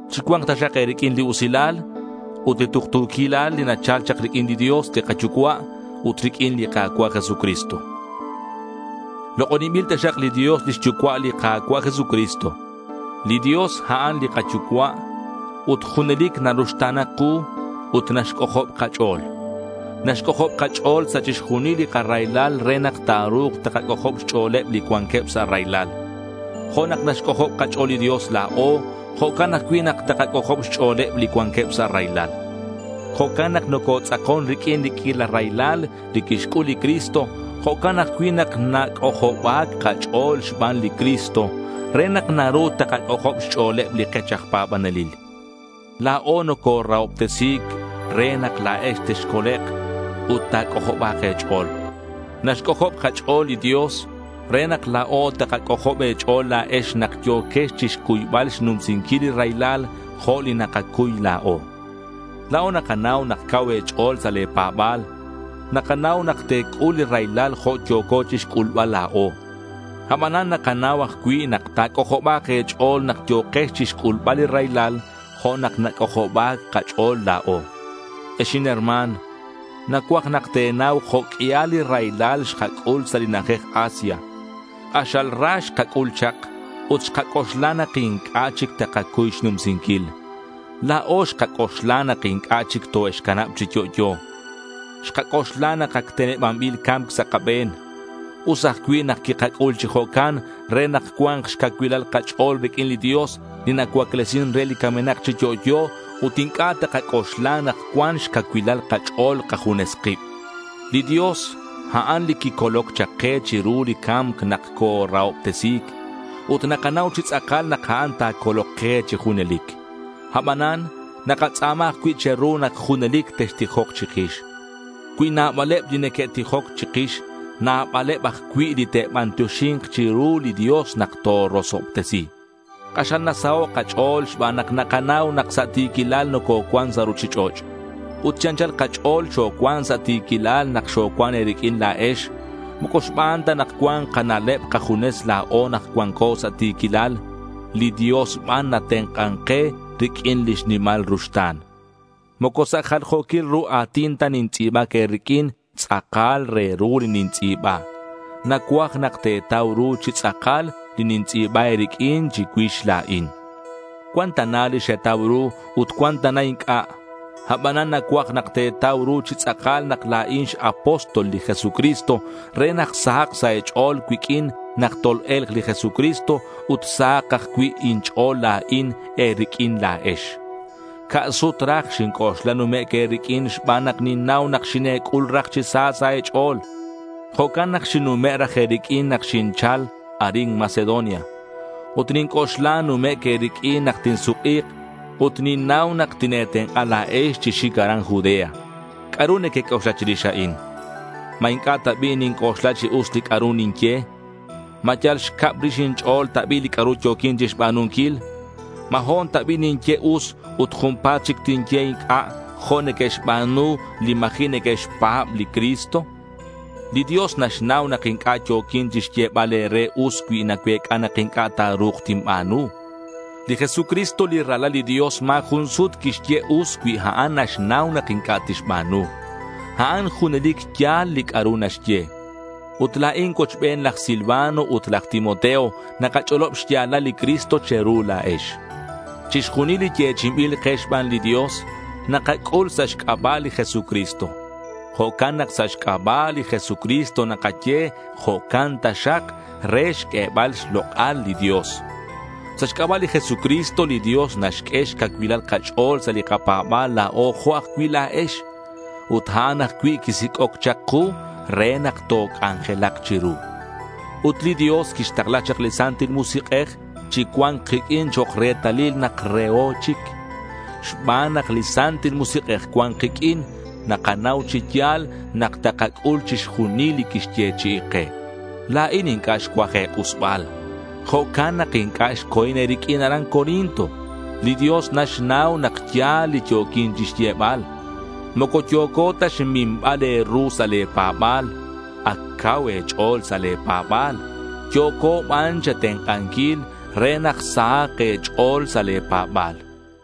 Chicua̱nk taxak e̱riq'uin li usilal ut li tuktu̱quilal li nachal chak riq'uin li Dios li kaYucua' ut riq'uin li Ka̱cua' Jesucristo. Lok'oninbil taxak li Dios lix Yucua' li Ka̱cua' Jesucristo. Li Dios, a'an li kaYucua' ut junelic naruxta̱na ku ut naxc'ojob kach'o̱l. Naxc'ojob kach'o̱l sa' chixjunil li karaylal re nak ta̱ru̱k takac'ojob xch'o̱leb li cuanqueb sa' raylal. Jo' nak naxc'ojob kach'o̱l li Dios la̱o, jo'can ajcui' nak takac'ojob xch'o̱leb li cuanqueb sa' raylal. Jo' nak nocotz'akon riq'uin li q'uila raylal li quixc'ul li Cristo, jo'can ajcui' nak nac'ojoba̱c kach'o̱l xban li Cristo, re nak naru takac'ojob xch'o̱leb li kech aj pa̱banelil. La̱o nocorahobtesi̱c re nak la̱ex texcolek' ut ta̱c'ojoba̱k e̱ch'o̱l. Naxc'ojob kach'o̱l li Dios re nak la̱o takac'ojob e̱ch'o̱l la̱ex nak yo̱quex chixcuybal xnumsinquil li raylal jo' li nakacuy la̱o. La̱o nakanau nak cau e̱ch'o̱l sa' le̱ pa̱ba̱l. Nakanau nak te̱c'ul li raylal jo' yo̱co chixc'ulbal la̱o. Abanan nakanau ajcui' nak ta̱c'ojoba̱k e̱ch'o̱l nak yo̱kex chixc'ulbal li raylal jo' nak nac'ojoba̱c kach'o̱l la̱o. Ex inherma̱n, nacuaj nak te̱nau jo' q'uial li raylal xkac'ul sa' li na'ajej Asia. K'axal ra xkac'ul chak ut xkac'oxla nak inc'a' chic takacuy xnumsinquil. La̱o xkac'oxla nak inc'a' chic toe'xcanab chi yo'yo. Xkac'oxla nak ac tenebanbil ca̱mc sa' kabe̱n. Us ajcui' nak quikac'ul chi jo'can re nak cua̱nk xcacuilal kach'o̱l riq'uin li Dios li nacuaclesin re li camenak chi yo'yo ut inc'a' takac'oxla nak cuan xcacuilal kach'o̱l kajunes kib. Li Dios, a'an li quicoloc chak ke chiru li ca̱mc nak corahobtesi̱c. Ut nakanau chi tz'akal nak a'an ta̱colok ke chi junelic. Abanan nakatz'a̱ma ajcui' che̱ru nak junelic textijok chikix. Cui nabaleb li neque'tijoc chikix, nabaleb ajcui' li te'bantioxi̱nk chiru li Dios nak torosobtesi. K'axal nasaho' kach'o̱l xban nak nakanau nak sa' ti̱quilal nococuan sa' ruchich'och'. Ut chi anchal kach'o̱l xocuan sa' ti̱quilal nak xocuan e̱riq'uin la̱ex. Moco xban ta nak cuan kana'leb kajunes la̱o nak cuanco sa' ti̱quilal. Li Dios ban natenk'an ke riq'uin lix nimal ruxta̱n. Moco sa' jaljo̱quil ru a̱tin ta nintz'i̱bac e̱riq'uin. Tz'akal re ru li nintz'i̱ba. Nacuaj nak te̱tau ru chi tz'akal li nintz'i̱ba e̱riq'uin chicuix la̱in. Cuan tana li xetau ru ut cuan tana inc'a'. Abanan nacuaj nak te̱tau ru chi tz'akal nak la̱in x-apóstol li Jesucristo re nak sahak sa' e̱ch'o̱l cuiq'uin nak tol-e̱lk li Jesucristo ut sahak ajcui' inch'o̱l la̱in e̱riq'uin la̱ex. Ca' sut raj xinc'oxla numec' e̱riq'uin xban nak ninnau nak xine̱c'ul raj chi sa sa' e̱ch'o̱l. Jo'can nak xinnume' raj e̱riq'uin nak xinchal arin Macedonia. Ut ninc'oxla numec' e̱riq'uin nak tinsuk'i̱k. Ut ninnau nak tine̱tenk'a la̱ex chi xic aran Judea. ¿C'a'ru nequec'oxla chirix a'in? ¿Ma inc'a' ta bi' ninc'oxla chi us li c'a'ru ninye? ¿Ma yal xcab rix inch'o̱l ta bi' li c'a'ru yo̱quin chixba̱nunquil? ¿Ma ho̱n ta bi' ninye us ut junpa̱t chic tinye inc'a' jo' neque'xba̱nu li ma̱ji' neque'xpa̱b li Cristo? Li Dios naxnau nak inc'a' yo̱quin chixyebal e̱re us cui nacuec'a nak inc'a' ta̱ru̱k tinba̱nu. Li Jesucristo li Ralal li Dios ma̱ jun sut quixye us cui a'an naxnau nak inc'a' tixba̱nu. A'an junelic ya̱l li c'a'ru naxye. Ut la̱in cuochbeneb laj Silvano ut laj Timoteo nakach'olob xya̱lal li Cristo che̱ru la̱ex. Chixjunil li yechi'inbil ke xban li Dios, nakac'ul sa' xc'aba' li Jesucristo. Jo'can nak sa' xc'aba' li Jesucristo nakaye “jo'can taxak” re xq'uebal xlok'al li Dios. Sa' xc'aba' li Jesucristo, li Dios naxq'ue xcacuilal kach'o̱l sa' li kapa̱ba̱l la̱o jo' ajcui' la̱ex. Ut a'an ajcui' quisic'oc chak ku re nak toc'anjelak chiru. Ut li Dios quixtakla chak li Santil Musik'ej chi cua̱nc kiq'uin chok' retalil nak reho chic. Xban nak li Santil Musik'ej cuan kiq'uin, nakanau chi ya̱l nak takac'ul chixjunil li quixyechi'i ke. La̱in inc'a' xcuaj e̱k'usbal. Jo'can nak inc'a' xco̱in e̱riq'uin aran Corinto. Li Dios naxnau nak ya̱l li yo̱quin chixyebal. Moco yo̱co ta xminbal e̱ru sa' le̱ pa̱ba̱l. Ac cau e̱ch'o̱l sa' le̱ pa̱ba̱l. Yo̱co ban che̱tenk'anquil re nak sahak e̱ch'o̱l sa' le̱ pa̱ba̱l.